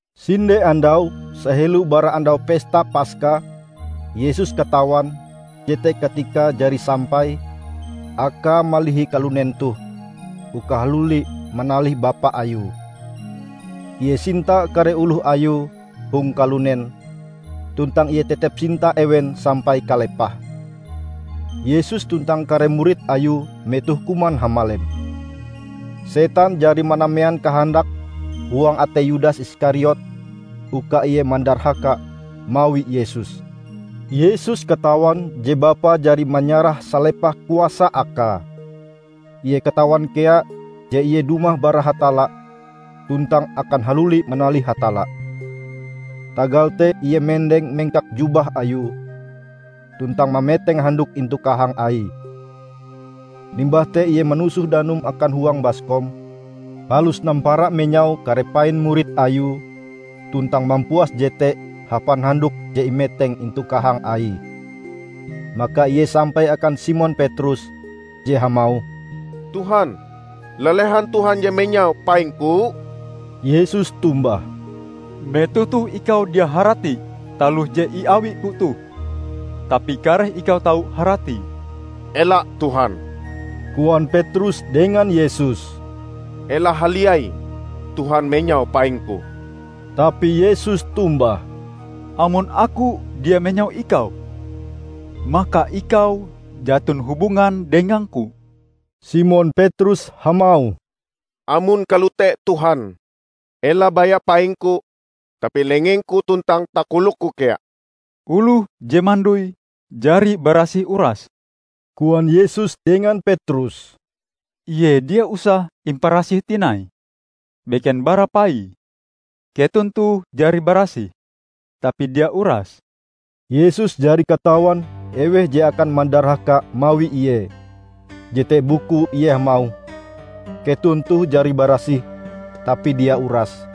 Sinde andau sahelo bara Andau Pesta Paska, Yesus katawan jete katikae jari sampai Akae malihi kalunen toh uka haluli manalih Bapa Ayue. Ie sinta kare oloh Ayue hong kalunen, tuntang Ie tetep sinta ewen sampai kalepahe. Yesus tuntang kare murid Ayue metohe kuman hamalem. Setan jari manamean kahandake huang atei Yudas Iskariot uka ie mandarhaka mawi Yesus. Yesus katawan je Bapa jari manyarah salepah kuasa Akae. Ie katawan kea je Ie dumah bara Hatalla tuntang akan haluli manalih Hatalla. Tagal te Ie mendeng mengkak jubah Ayue, tuntang mameteng handuk intu kahang Aie. Limbah te Ie manusoh danum akan huang baskom, palus nampara menyau kare pain murid Ayue tuntang mampuas jete hapan handuk je imeteng intu kahang Aie. Maka Ie sampai akan Simon Petrus, je hamauh, "Tuhan, lalehan Tuhan je menyau paingku?" Yesus tombah, "Metoh toh ikau dia harati taloh je iawi-Ku toh, tapi kareh ikau tau haratie." "Ela Tuhan," koan Petrus dengan Yesus, "ela haliai Tuhan menyau paingku!" Tapi Yesus tombah, "Amon Aku dia menyau ikau, maka ikau jaton hubungan dengang-Ku." Simon Petrus hamauh, "Amon kalote, Tuhan, ela baya paingku tapi lengengku tuntang takolokku kea!" "Oloh je mandoi, jari barasih urase," koan Yesus dengan Petrus. "Ie dia usah imparasih tinai; beken bara paie. Keton toh jari barasih, tapi dia urase." ( Yesus jari katawan eweh je akan mandarhaka mawi Ie. Jete bukue Ie hamauh, "keton toh jari barasih, tapi dia urase.")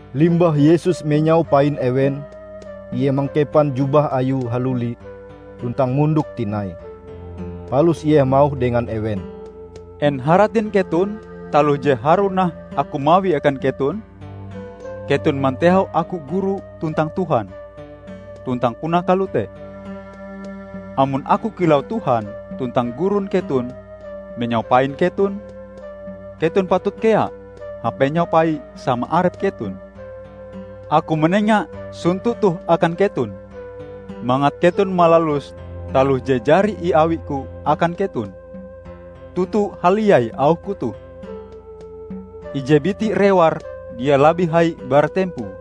Limbah Yesus menyau pain ewen, Ie mangkepan jubah Ayue haluli tuntang mondok tinai. Palus Ie hamauh dengan ewen, "En haratin keton taloh je harue nah Aku mawie akan keton? Keton mantehau Aku Guru tuntang Tuhan. Tuntang puna kalote. Amon Aku kilau Tuhan tuntang Gurun keton menyau pain keton, keton patut kea hapenyau pai sama arep keton. Aku manenga sonto toh akan keton mangat keton malalus taloh je jari iawi-Ku akan keton. Toto haliai auh-Ku toh: Ije biti rewar dia labih hai bara tempoe,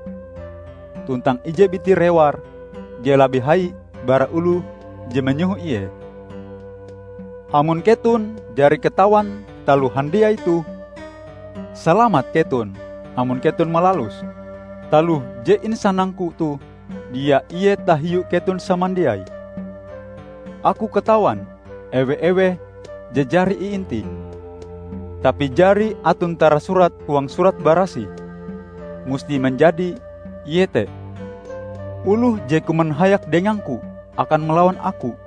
tuntang ije biti rewar dia labih hai bara oloh je manyoho ie. Amon keton jari katawan taloh handiai toh, salamat keton amon keton malaluse. Taloh je isanang-Ku toh dia ie tahiu keton samandiai. Aku katawan ewe-eweh je jari iintih. Tapi jari aton tarasurat huang Surat Barasih, musti manjadi, iete 'Oloh je kuman hayak dengang-Ku, akan malawan Aku.'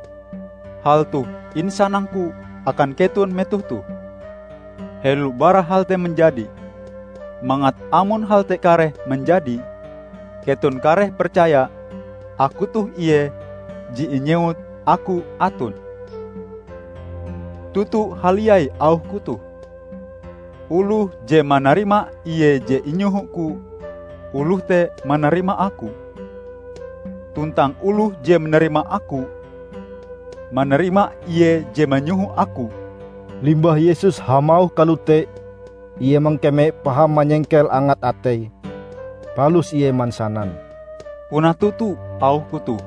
Hal toh insanang-Ku akan keton metoh toh, helo bara hal te manjadi, mangat amon hal te kareh manjadi, keton kareh percaya Aku toh Ie je inyewut AKU ATON. Toto haliai auh-Ku toh: Oloh je manarima ie je inyoho-Ku, oloh te manarima Aku. Tuntang oloh je manarima Aku, manarima Ie je manyoho Aku." Limbah Yesus hamauh kalote, Ie mangkeme paham manyengkel angat ateie. Palus Ie mansanan, "Puna toto auh-Ku toh: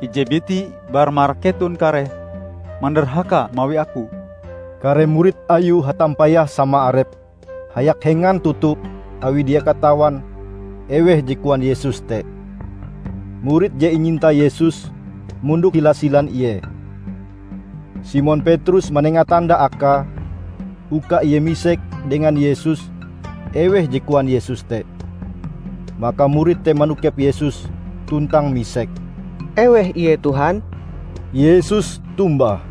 Ije biti bara marak keton kareh mandarhaka mawi Aku." Kare murid Ayue hatampayah sama arepe hayak hengan toto awi dia katawan eweh je koan Yesus te. Murid je inyinta Yesus mondok hila silan Ie. Simon Petrus manenga tanda akae, uka ie misek dengan Yesus eweh je koan Yesus te. Maka murid te manokep Yesus tuntang misek, "Eweh ie Tuhan?" Yesus tombah,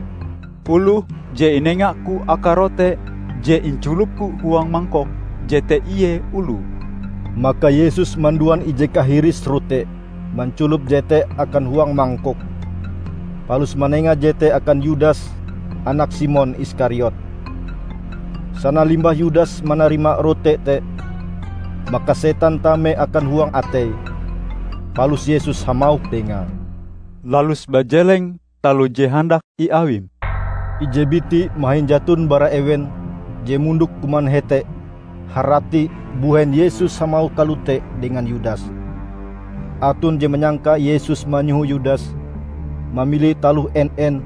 "Oloh je inenga-Ku akae rote je inculop-Ku huang mangkok, jete ie oloe." Maka Yesus manduan ije kahiris rote, manculop jete akan huang mangkok; palus manenga jete akan Yudas anak Simon Iskariot. Sana limbah Yudas manarima rote te, maka setan tame akan huang ateie. Palus Yesus hamauh dengae, "Lalus bajeleng taloh je handak iawim." Ije biti mahin jaton bara ewen je mondok kuman hete harati mbuhen Yesus hamauh kalote dengan Yudas. Aton je manyangka Yesus manyoho Yudas mamili taloh en-en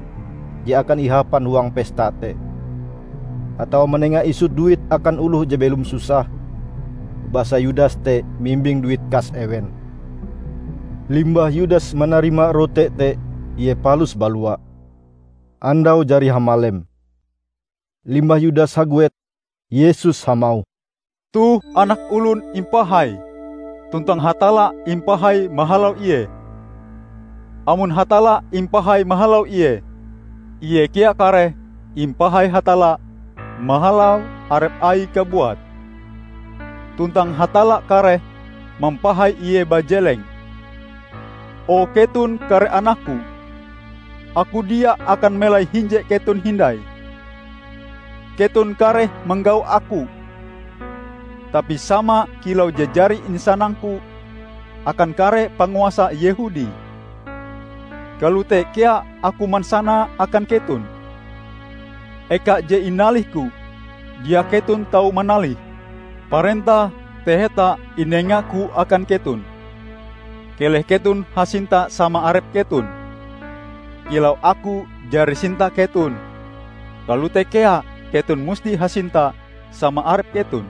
je akan ihapan huang pesta te, atawa manenga isut duit akan oloh je belom susah -- basa Yudas te mimbing duit kas ewen. Limbah Yudas manarima rote te, ie palus balua. Andau jari hamalem. Limbah Yudas haguet, Yesus hamauh, "Toh Anak Olon impahai, tuntang Hatalla impahai mahalau Ie. Amon Hatalla impahai mahalau Ie, Ie kea kareh impahai Hatalla mahalau arep Aie kabuat. Tuntang Hatalla kareh mampahai Ie bajeleng. O keton kare anak-Ku, Aku dia akan melai hinje keton hindai. Keton kareh manggau Aku, tapi sama kilau je jari insanang-Ku akan kare panguasa Yehudi, kalote kea Aku mansanae akan keton; eka je inalih-Ku, dia keton tau manalihe. Parentah taheta inenga-Ku akan keton: Keleh keton hasinta sama arep keton. Kilau Aku jari sinta keton, kalote kea keton musti hasinta sama arep keton.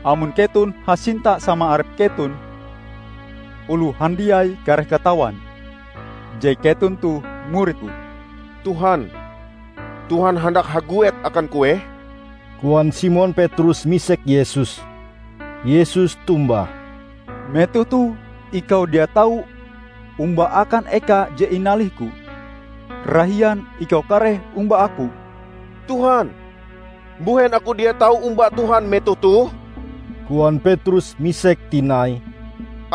Amon keton hasinta sama arep keton, oloh handiai kareh katawan je keton toh murid-Ku." "Tuhan, Tuhan handak haguet akan kueh?" koan Simon Petrus misek Yesus. Yesus tombah, "Metoh toh ikau dia tau omba akan eka je inalih-Ku. Rahian ikau kareh omba Aku." "Tuhan mbuhen aku dia tau omba Tuhan metoh toh?" koan Petrus misek tinai.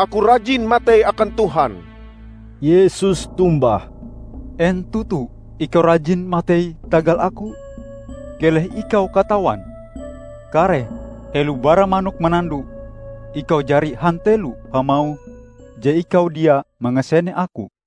"Aku rajin matei akan Tuhan!" Yesus tombah, "En toto ikau rajin matei tagal Aku? Keleh ikau katawan, kareh, helo bara manok manando, ikau jari hantelo hamauh je ikau dia mangasene Aku!"